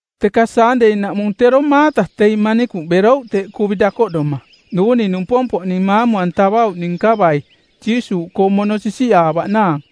Teka Saandei-naꞌmung tero maata teing manikuꞌ berouꞌ teꞌ kuvi dakoꞌdoma, duuni numpompoꞌning maamu-antavauꞌning nkavai, Jiisuuꞌkoong mono sisiꞌaavaꞌnaang.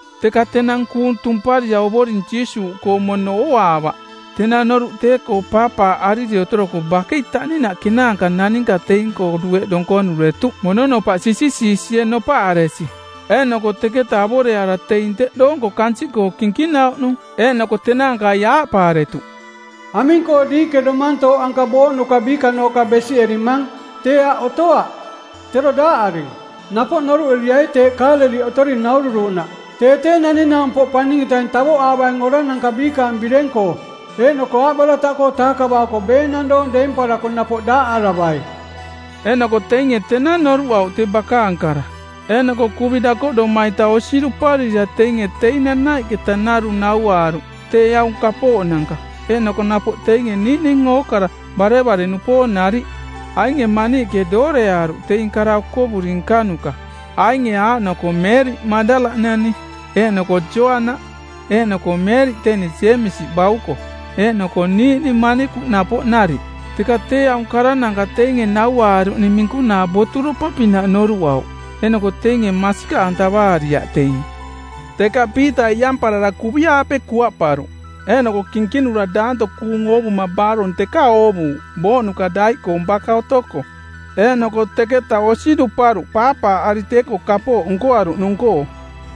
Teka tenang kuung tumparira Ovoring Jiisuuꞌkoong mono ooaavaꞌ. Tenang noruꞌ tee-koo paapaaꞌariri otoroko bakei taꞌninaꞌ kenaanka naninka teing-koo dueꞌ donkonuretuꞌ mononopaꞌ sisisiisie nopaꞌaresi. Eeꞌnoko teketa avoreaara teing teꞌ doonko kansiꞌkoo kinkinauꞌnung, eeꞌnoko tenaankai aaꞌpaaretuꞌ, “Aming-koo diiꞌke tee domantooꞌ anka booꞌnuka biikanooꞌka besiꞌerimang? Tee aꞌ otoaꞌ; tero daaꞌaring; Napoꞌ noruꞌeriai teeꞌ Kaaleliꞌ otori naururuꞌnaꞌ, tee tee Naning-naumpoꞌ Paning-etaing tavoꞌaavaing orananka biikaang bireng-koo eeꞌnoko aaꞌbarataꞌkoo taakavaako beenang doong deemparako napoꞌ daaꞌaravai.” Eeꞌnoko teinge tenang noruꞌauꞌ tee bakaang kara. Eeꞌnoko kuvi dakoꞌdoma-ita osi duparira teinge teing nanaiꞌketa narung nauaaruꞌ tee aung kapooꞌnanka, eeꞌnoko napoꞌ teing niiꞌning ookara barevare-nupoong nariꞌ. Ainge maniiꞌke dooreaaruꞌ teing kara okovuri nkanuka, ainge aaꞌnoko Meeriꞌ Maꞌdala-nani, eeꞌnoko Joana eeꞌnoko Meeriꞌ teni Jeemisi bauko, eeꞌnoko niiꞌning manikuꞌ napoꞌ nariꞌ. Teka tee aung karananka teinge nauaaruꞌning minkunaa boturopa-pinaꞌ noruꞌauꞌ. Eeꞌnoko teinge masikaꞌantavaariaꞌ teing. Teka Piita iꞌamparara kuvi-aape kuaꞌparuꞌ, eeꞌnoko kinkinura daanto kuung oovuma baarong teka oovuuꞌ booꞌnuka daiꞌkoong baka otoko. Eeꞌnoko teketa osi duparuꞌ paapaaꞌari tee-koo kapooꞌ nkoaruꞌnung-koo.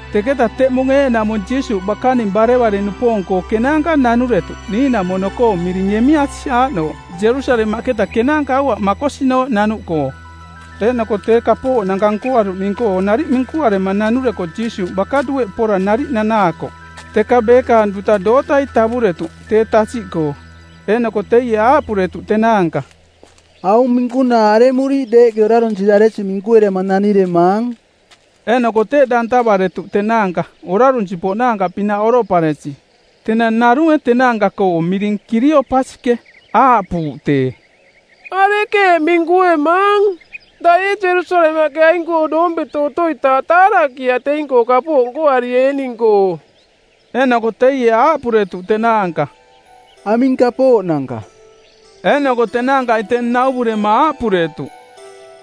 Teketa teꞌmung eeꞌnaꞌmung Jiisuuꞌ bakaning barevare-nupoong-koo kenaanka nanuretuꞌ niiꞌnamono-koo miring Emeasi aaꞌnooꞌ Jerusalemaꞌketa kenaanka aua makosinooꞌ nanuꞌkoo. Eeꞌnoko tee kapooꞌnanka nkoaruꞌning-koo nariꞌ minkuarema nanureko Jiisuuꞌ baka dueꞌ pora nariꞌ nanaakoꞌ. Teka beekaang duta dootai tavuretuꞌ tee tasiꞌkoo. Eeꞌnoko teie aaꞌpuretuꞌ tenaanka, “Aung minkunaa aremuriiꞌ deeꞌke orarunsiraresi minkuerema naniremaang?” Eeꞌnoko teꞌ dantavaretuꞌ tenaanka orarunsi-poꞌnaanka-pinaꞌ oroꞌparesi. Tenang narunge tenaanka-koo miring Kiliopasiꞌke aaꞌpuuꞌ tee, “Arekeeꞌ minkuemaang? Daꞌ ee Jerusalemaꞌke aing-koo doompeto otoitaaꞌ taarakiaꞌ teing-koo kapooꞌ nkoarieening-koo?” Eeꞌnoko teie aaꞌpuretuꞌ tenaanka, “Aming kapooꞌnanka?” Eeꞌnoko tenaankai tee nauvurema aaꞌpuretuꞌ,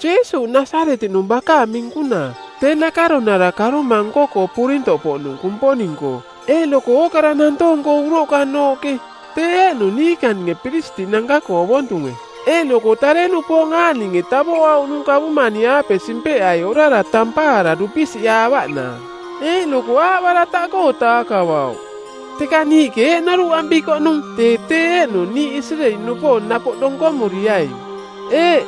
“Jiisuuꞌ Nasaretiꞌnung bakaang minkunaa, tee nakaronara karoma nko-koo purintoꞌpoꞌnung Kumponing-koo eeꞌnoko ookara nantoong-koo uroꞌkanooꞌke. Tee eeꞌnung niikaninge piristiꞌnanka-koo ovontunge eeꞌnoko tare-nupoong aaꞌninge tavoꞌauꞌnung kavumani-aape simpeꞌai orara tampaara dupisiꞌaavaꞌnaang, eeꞌnoko aaꞌbarataꞌkoo taakavauꞌ. Teka niiꞌke eeꞌ noruꞌampikoꞌnung tee tee eeꞌnung niiꞌ Isireeli-nupoong napoꞌ donkomuriaing. Eeꞌ,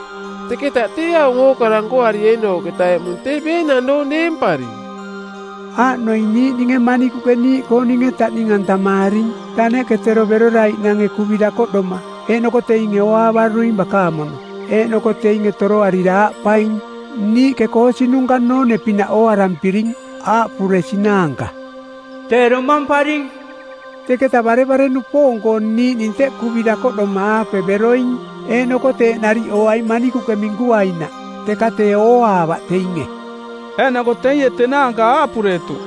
teketa tee aung ookara nkoarieenooꞌketa eꞌmung tee beenang doong deemparing. Aaꞌnoing niiꞌninge manikuꞌke niiꞌkooninge taꞌning-antamaaring. Taneꞌke tero beroraiꞌnange kuvi dakoꞌdoma eeꞌnoko teinge ooaavaruing bakaang mono; Eeꞌnoko teinge toroarira aaꞌpaing, ‘Niiꞌke koosinunka noone-pinaꞌ ooarampiring, aaꞌpuresinaanka, “Tee domamparing.” ’ Teketa barevare-nupoong-koo niiꞌning teꞌ kuvi dakoꞌdoma-aape beroing, eeꞌnoko teeꞌ nariꞌ ooai manikuꞌke minkuainaꞌ, teka tee ooaavaꞌ teinge.” Eeꞌnoko teie tenaanka aaꞌpuretuꞌ,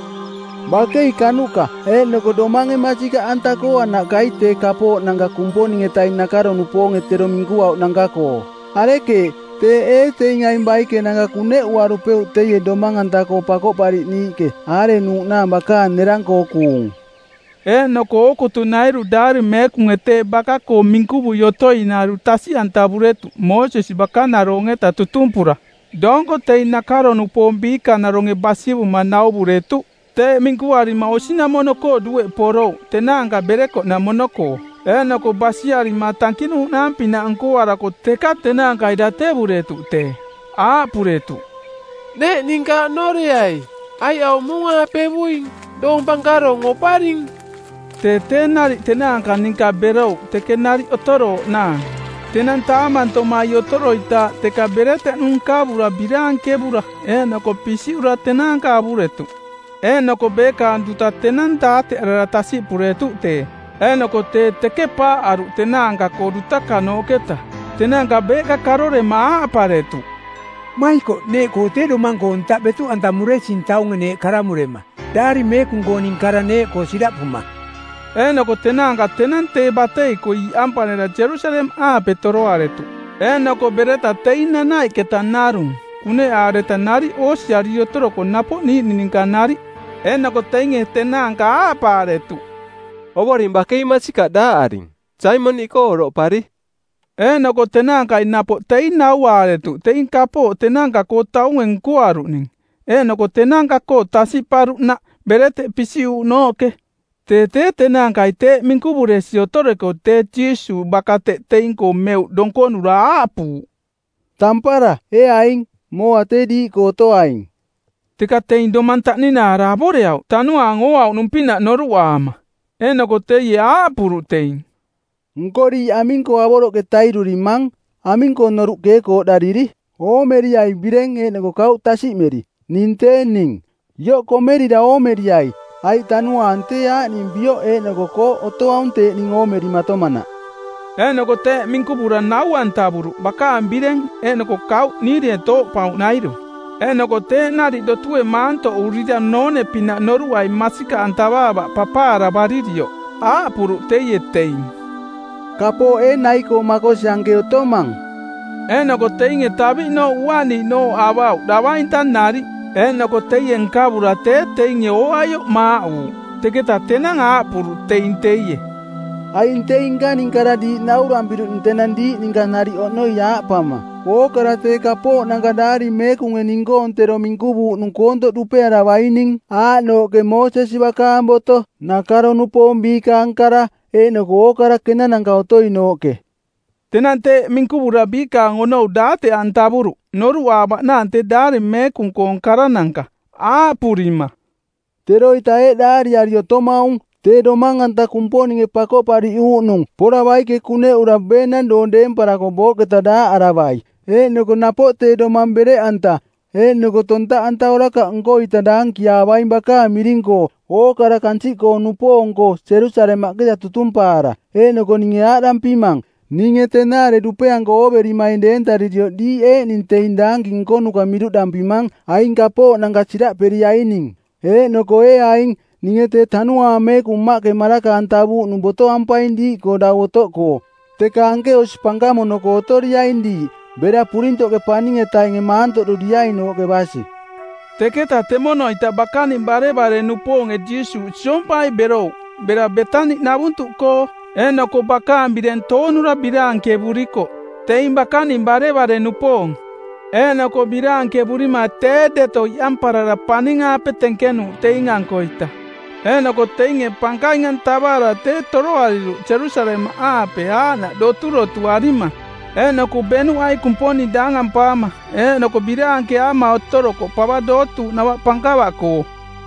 “Bakei kanuꞌka eeꞌnoko domange masikaꞌanta-koo anaꞌkai tee kapooꞌnanka Kumponing-etaing nakaro-nupoonge tero minkuauꞌnanka-koo. Arekeeꞌ, teeꞌ ee teing aing baikenanka kuneꞌuarupeuꞌ teie domang-anta-koo Pakoꞌpariꞌniiꞌke aarenuuꞌnaang bakaang nerang-koo kuung?” Eeꞌnoko ookutunairu Daari Meekunge tee baka-koo minkuvui otoinairu tasiꞌantavuretuꞌ Moosesi bakanarong-eta tutumpura doonko teing nakaro-nupoong biikanaronge basivuma nauvuretuꞌ. Teeꞌ minkuarima osinamono-koo dueꞌ porouꞌ tenaanka berekoꞌnamono-koo. Eeꞌnoko basiarima tankinuuꞌnaang-pinaꞌ nkoarako teka tenaankai datevuretuꞌ tee. Aaꞌpuretuꞌ, “Neeꞌ ninka oꞌnoreai, aiꞌ aung muung-aapevuing, doong pankarong oparing.” Tee tee nariꞌ tenaanka ninka berouꞌ teke nariꞌ otorooꞌnaang. Tenang taamantomai otoroitaaꞌ teka bereteꞌnu nkavura biraankevura eeꞌnoko pisiꞌura tenaanka avuretuꞌ. Eeꞌnoko beekaang duta tenang daateꞌarara tasiꞌpuretuꞌ tee, eeꞌnoko tee teke paaꞌaruꞌ tenaanka-koo dutakanooꞌketa. Tenaanka beeꞌka karorema aaꞌparetuꞌ, “Maikoꞌ, neeꞌkoo tee domang-koo ntaꞌ betuꞌantamuresing taunge neeꞌ karamurema Daari Meekung-kooning kara neeꞌkoo siraꞌpuma!” Eeꞌnoko tenaanka tenang tee batei-koo iꞌampareta Jerusalemaꞌaape toroaretuꞌ eeꞌnoko bereta teing nanaiꞌketa narung kuneꞌaareta nariꞌ oosiariri otoroko napoꞌ niiꞌning ninka nariꞌ. Eeꞌnoko teinge tenaanka aaꞌpaaretuꞌ, “Ovoring bakei masikaꞌ daaꞌaring. Saimoniꞌkoo oroꞌpari.” Eeꞌnoko tenaankai napoꞌ teing nauaaretuꞌ teing kapooꞌ tenaanka-koo taunge nkoaruꞌning, eeꞌnoko tenaanka-koo tasiꞌparuꞌnaꞌ bereteꞌ pisiꞌuuꞌnooꞌke. Tee tee tenaankai teeꞌ minkuvuresi otoreko tee Jiisuuꞌ baka teꞌ teing-koo meuꞌ donkonura aaꞌpuuꞌ, “Tampara, ee aing! Mooa tee diiꞌkoo otoaing!” Teka teing domang taꞌninaara avoreauꞌ tanuaang ooauꞌnung-pinaꞌ noruꞌaama. Eeꞌnoko teie aaꞌpuruꞌ teing, “Nko diiꞌ aming-koo avoroꞌke tairurimang? Aming-koo noruꞌ keekooꞌdariri? Oomeriai bireng eeꞌnoko kauꞌ tasiꞌmeri, ning tee ning. Ioꞌ komerira oomeriai, aiꞌ tanuaang tee aaꞌning bioꞌ eeꞌnoko kooꞌ otoaung teeꞌ ning oomerimatomanaꞌ.” Eeꞌnoko teeꞌ minkuvurira nau-antavuruꞌ bakaang bireng eeꞌnoko kauꞌ niirie tooꞌpauꞌnairu. Eeꞌnoko teeꞌ nariꞌ dotue maantoꞌurira noone-pinaꞌ noruꞌai masikaꞌantavaavaꞌ papaaravaririoꞌ aaꞌpuruꞌ teie teing, “Kapooꞌ ee nai-koo makosi anke otomang?” Eeꞌnoko teinge taviꞌnooꞌ uaꞌniiꞌnooꞌ avauꞌ, davainta nariꞌ. Eeꞌnoko teie nkavura tee teinge ooaioꞌ maaꞌuuꞌ. Teketa tenang aaꞌpuruꞌ teing teie, “Aing teing nkaning kara diiꞌ naurampiruꞌning tenang diiꞌ ninka nariꞌ oꞌnoi aaꞌpama: Ookara tee kapooꞌnanka Daari Meekunge ning-koong tero minkuvuuꞌnung koontoꞌ dupearavaining aaꞌnooꞌke Moosesi bakaang boto, nakaro-nupoong biikaang kara, eeꞌnoko ookara kenananka otoinooꞌke.” Tenang teeꞌ minkuvura biikaang onou daateꞌantavuruꞌ noruꞌaavaꞌnaang tee Daari Meekung-koong karananka aaꞌpurima, “Teroita eeꞌ daariari otomaung, tee Domang-anta Kumponinge Pakoꞌpariꞌuuꞌnung˜ pora baike kuneꞌura beenang doong deemparako booꞌketa daaꞌaravai, eeꞌnoko napoꞌ tee domang bereꞌanta eeꞌnoko tontaꞌanta orakaꞌ nko-ita daankiaavaing bakaang miring-koo ookara kansiꞌkoo-nupoong-koo Jerusalemaꞌketa tutumpaara. Eeꞌnoko ninge aaꞌdampimang, ninge tenaare dupeanko ooverimaing deentaririoꞌ diiꞌ eeꞌning teing daanki nkonuka miruꞌdampimang aing kapooꞌnanka siraꞌperiaining. Eeꞌnoko ee aing, ninge tee Tanuaang Meekung Mmaꞌke maraka-antavuuꞌnung botoampaing diiꞌkoo dau otoꞌkoo. Teka anke osi pankamono-koo otoriaing diiꞌ bera purintoꞌke paning-etainge maantoꞌduriainooꞌke basi.” Teketa temono-ita bakaning barevare-nupoonge Jiisuuꞌ siompai berouꞌ bera Beetani-navuntuꞌkoo, eeꞌnoko bakaang bireng toonura biraankevurikoꞌ teing bakaning barevare-nupoong. Eeꞌnoko biraankevurima tee deto iꞌamparara paning-aape tenkenuuꞌ teing-ankoita. Eeꞌnoko teinge pankaing-antavaara tee toroariruꞌ Jerusalemaꞌaape aaꞌnaꞌ doturotuarima. Eeꞌnoko beꞌnuꞌai Kumponing daangampaama eeꞌnoko biraankeaama otorokoꞌ pava dootuuꞌnava pankava-koo.